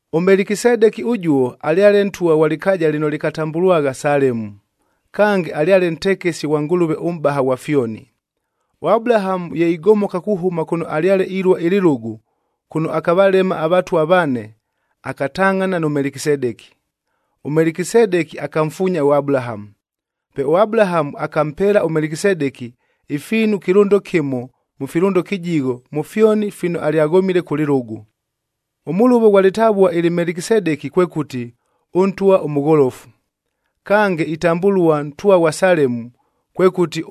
ɄMelekisedeki ʉjuo alyale ntwa ghwa lɨkaaja lɨno lɨkatambʉlwagha Salemu, kange alyale ntekesi ghwa Ngʉlʉve ʉMʼbaha ghwa fyoni. ɄAbulahamu ye igomoka kuhʉma kʉno alyale ilua ɨlɨlʉgʉ, kʉno akavalema avatwa vane, akatangʼhana nʉ Melekisedeki. ɄMelekisedeki akamfuunya ʉAbulahamu. Pe ʉAbulahamu akampeela ʉMelekisedeki ifiinu ɨkɨlʉndo kɨmo mʉ filʉndo kɨjigho mʉ fyoni fino alyaghomile kʉ lɨlʉgʉ. Ʉmʉlʉvo ghwa lɨtavua ɨlɨ Melekisedeki kwekʉti, “Ʉntwa ʉmʉgholofu.” Kange, itambʉlua ntwa ghwa Salemu, kwekʉti,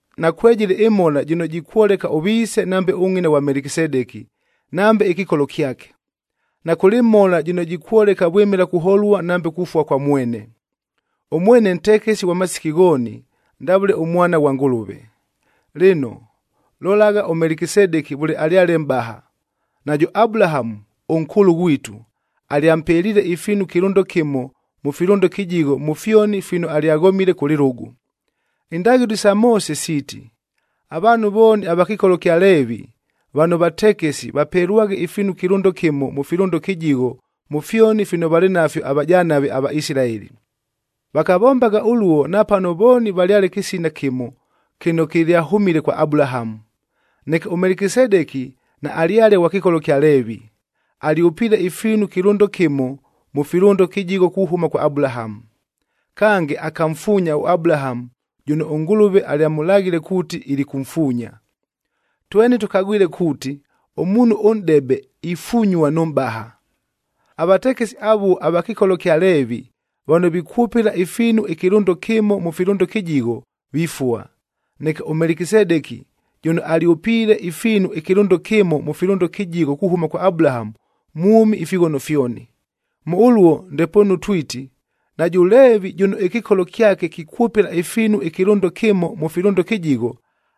Nakwejɨlɨ ɨmhola jɨno jikwoleka ʉviise nambe ʉngʼina ghwa Melekisedeki, nambe ɨkɨkolo kyake. Nakʉlɨ mhola jɨno jikwoleka vwɨmɨla kuholua nambe kufua kwa mwene. Ʉmwene ntekesi ghwa masiki ghooni, ndavʉle ʉMwana ghwa Ngʉlʉve. Lɨno, lolagha ʉMelekisedeki vʉle alyale mʼbaha, najʉ Abulahamu, ʉnkʉʉlʉ ghwitu, alyampeliile ifiinu ɨkɨlʉndo kɨmo mʉ filʉndo kɨjigho mʉ fyoni fino alyaghomile kʉ lɨlʉgʉ. Indaghɨlo isa Moose siiti, avaanhu vooni ava kɨkolo kya Leevi,b vano vatekesi vapelwaghe ifiinu ɨkɨlʉndo kɨmo mʉ filʉndo kɨjigho mʉ fyoni fino valɨ nafyo avajanave aVaisilaeli. Vakavombagha ʉluo napano vooni valyale kɨsina kɨmo kɨno kɨlyahʉmile kwa Abulahamu. Neke ʉMelekisedeki naalyale ghwa kɨkolo kya Leevi, alyʉpiile ifiinu ɨkɨlʉndo kɨmo mʉ filʉndo kɨjigho kuhʉma kwa Abulahamu. Kange, akamfuunya ʉAbulahamu jʉno ʉNgʉlʉve alyamʉlaghile kuuti ilikʉmfuunya. Tweni tʉkagwile kuuti, ʉmuunhu ʉnʼdebe ifunyua nʉ mʼbaha. Avatekesi avuo ava kɨkolo kya Leevi vano vikwʉpɨla ifiinu ɨkɨlʉndo kɨmo mʉ filʉndo kɨjigho, vifua. Neke ʉMelekisedeki jʉno alyʉpiile ifiinu ɨkɨlʉndo kɨmo mʉ filʉndo kɨjigho kuhʉma kwa Abulahamu, mwʉmi ifighono fyoni. Mʉ ʉluo ndepoonu twiti, najʉ Leevi jʉno ɨkɨkolo kyake kikwʉpɨla ifiinu ɨkɨlʉndo kɨmo mʉ filʉndo kɨjigho,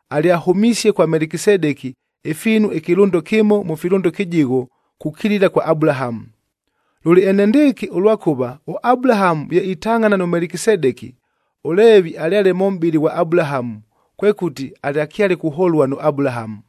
alyahʉmisie kwa Melekisedeki ifiinu ɨkɨlʉndo kɨmo mʉ filʉndo kɨjigho kukilila kwa Abulahamu. Lʉlɨ enendɨɨkɨ, ʉlwakʉva ʉAbulahamu ye itangʼhana nʉ Melekisedeki, ʉLeevi alyale mʉ mʼbɨlɨ ghwa Abulahamu, kwekʉti alyakyale kuholua nʉ Abulahamu.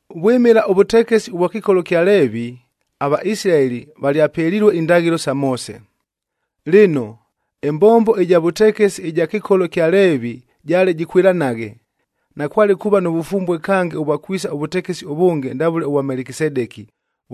Vwɨmɨla ʉvʉtekesi ʉvwa kɨkolo ɨkya Leevi, aVaisilaeli valyapelilue indaghɨlo sa Moose. Lɨno, ɨmbombo ɨja vʉtekesi ɨja kɨkolo kya Leevi jaale jɨkwɨlanaghe, nakwale kuuva nʉ vʉfumbue kange ʉvwa kwisa ʉvʉtekesi ʉvʉnge ndavʉle ʉvwa Melekisedeki,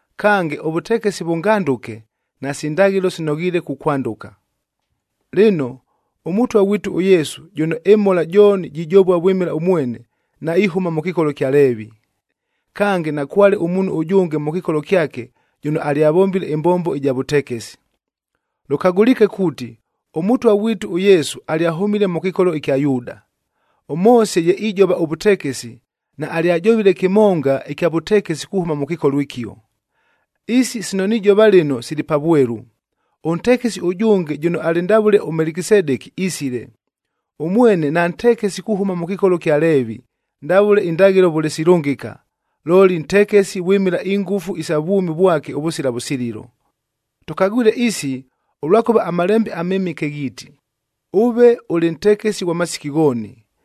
Kange, ʉvʉtekesi vʉngandʉke, nasi ndaghɨlo sinoghiile kukwandʉka. Lɨno, ʉMʉtwa ghwitu ʉYesu jʉno ɨmhola jooni jijova vwɨmɨla ʉmwene, naihʉma mʉ kɨkolo ɨkya Leevi. Kange, nakwale ʉmuunhu ʉjʉnge mʉ kɨkolo kyake jʉno alyavombile ɨmbombo ɨja vʉtekesi. Lʉkagʉliike kuuti, ʉMʉtwa ghwitu ʉYesu alyahʉmile mʉ kɨkolo ɨkya Yuuda. ɄMoose ye ijova ʉvʉtekesi, naalyajovile kɨmonga ɨkya vʉtekesi kuhʉma mʉ kɨkolo ɨkio. Isi sino nijova lɨno sili pa vwelu, ʉntekesi ʉjʉnge jʉno alɨ ndavʉle ʉMelekisedeki isile. Ʉmwene nantekesi kuhʉma mʉ kɨkolo kya Leevi, ndavʉle indaghɨlo vʉle silʉngɨka, looli ntekesi vwɨmɨla ingʉfu isa vwʉmi vwake ʉvʉsila vʉsililo. Tʉkagwile isi, ʉlwakʉva aMalembe aMɨmɨke ghiiti, “Ʉve ʉlɨ ntekesi ghwa masiki ghooni,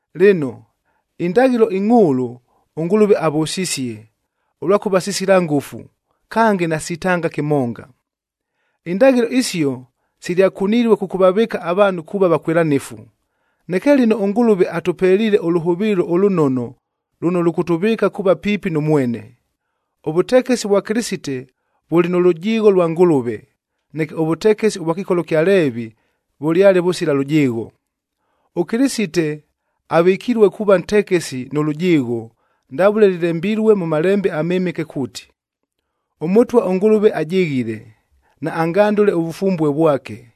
Lɨno, indaghɨlo ingʼhʉʉlʉ, ʉNgʉlʉve avʉsisie, ʉlwakʉva sisila ngʉfu, kange nasitanga kɨmonga. Indaghɨlo isio silyakunilue kʉkʉvavɨɨka avaanhu kuuva vakwɨlanɨfu. Neke lɨno ʉNgʉlʉve atʉpeliile ʉlʉhʉvɨɨlo ʉlʉnono lʉno lʉkʉtʉvɨɨka kuuva piipi nʉ Mwene. Ʉvʉtekesi vwa Kɨlɨsite vʉlɨ nʉ lʉjɨɨgho lwa Ngʉlʉve, neke ʉvʉtekesi ʉvwa kɨkolo kya Leevi vʉlyale vʉsila lʉjɨɨgho. ɄKɨlɨsite avɨkilue kuuva ntekesi nʉ lʉjɨɨgho, ndavʉle lɨlembilue mʉ Malembe aMɨmɨke kuuti, “ɄMʉtwa ʉNgʉlʉve ajɨghile, naangandʉle ʉvʉfumbue vwake.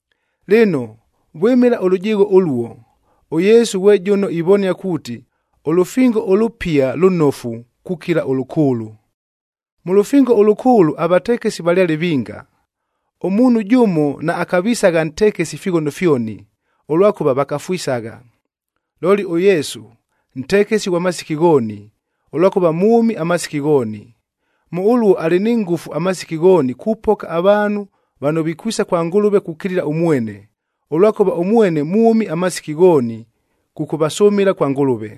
Lɨno, vwɨmɨla ʉlʉjɨɨgho ʉluo, ʉYesu ghwe jʉno ivonia kuuti ʉlʉfingo ʉlʉpiaf lʉnofu kukila ʉlʉkʉʉlʉ. Mʉ Lʉfingo ʉLʉkʉʉlʉg avatekesi valyale vinga, ʉmuunhu jʉmo naakavisagha ntekesi ifighono fyoni, ʉlwakʉva vakafwisagha. Looli ʉYesu, ntekesi ghwa masiki ghooni, ʉlwakʉva mwʉmi amasiki ghooni. Mʉ ʉluo alɨ ni ngʉfu amasiki ghooni kupoka avaanhu vano vikwisa kwa Ngʉlʉve kukilila ʉmwene, ʉlwakʉva ʉmwene mwʉmi amasiki ghooni kʉkʉvasʉmɨla kwa Ngʉlʉve.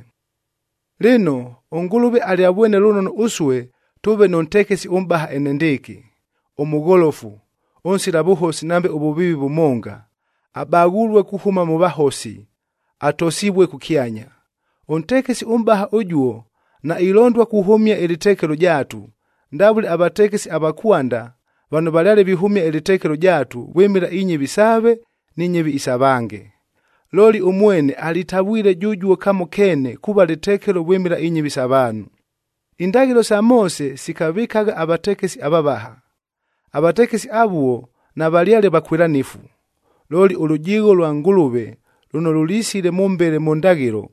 Lɨno, ʉNgʉlʉve alyavwene lʉnono ʉsue tʉʉve nʉ ntekesi ʉmʼbaha enendɨɨkɨ, ʉmʉgholofu, ʉnsila vʉhosi nambe ʉvʉviivi vʉmonga, abaghulue kuhʉma mʉ vahosi, atosivue kʉkyanya. Ʉntekesi ʉmʼbaha ʉjuo nailondua kuhʉmia ɨlɨtekelo jaatu, ndavʉle avatekesi ava kwanda vano valyale vihʉmia ɨlɨtekelo jaatu vwɨmɨla inyɨvi saave ni nyɨvi isa vange. Looli ʉmwene alitavwile jʉjuo kamo keene kuuva lɨtekelo vwɨmɨla inyɨvi sa vaanhu. Indaghɨlo sa Moose sikavɨkagha avatekesi avavaha. Avatekesi avuo navalyale vakwɨlanɨfu. Looli ʉlʉjɨɨgho lwa Ngʉlʉve lʉno lʉlisile mʉmbele mʉ ndaghɨlo,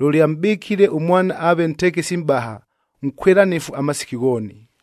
lʉlyamʼbɨkile ʉMwana aave ntekesi mʼbaha, nkwɨlanɨfu amasiki ghooni.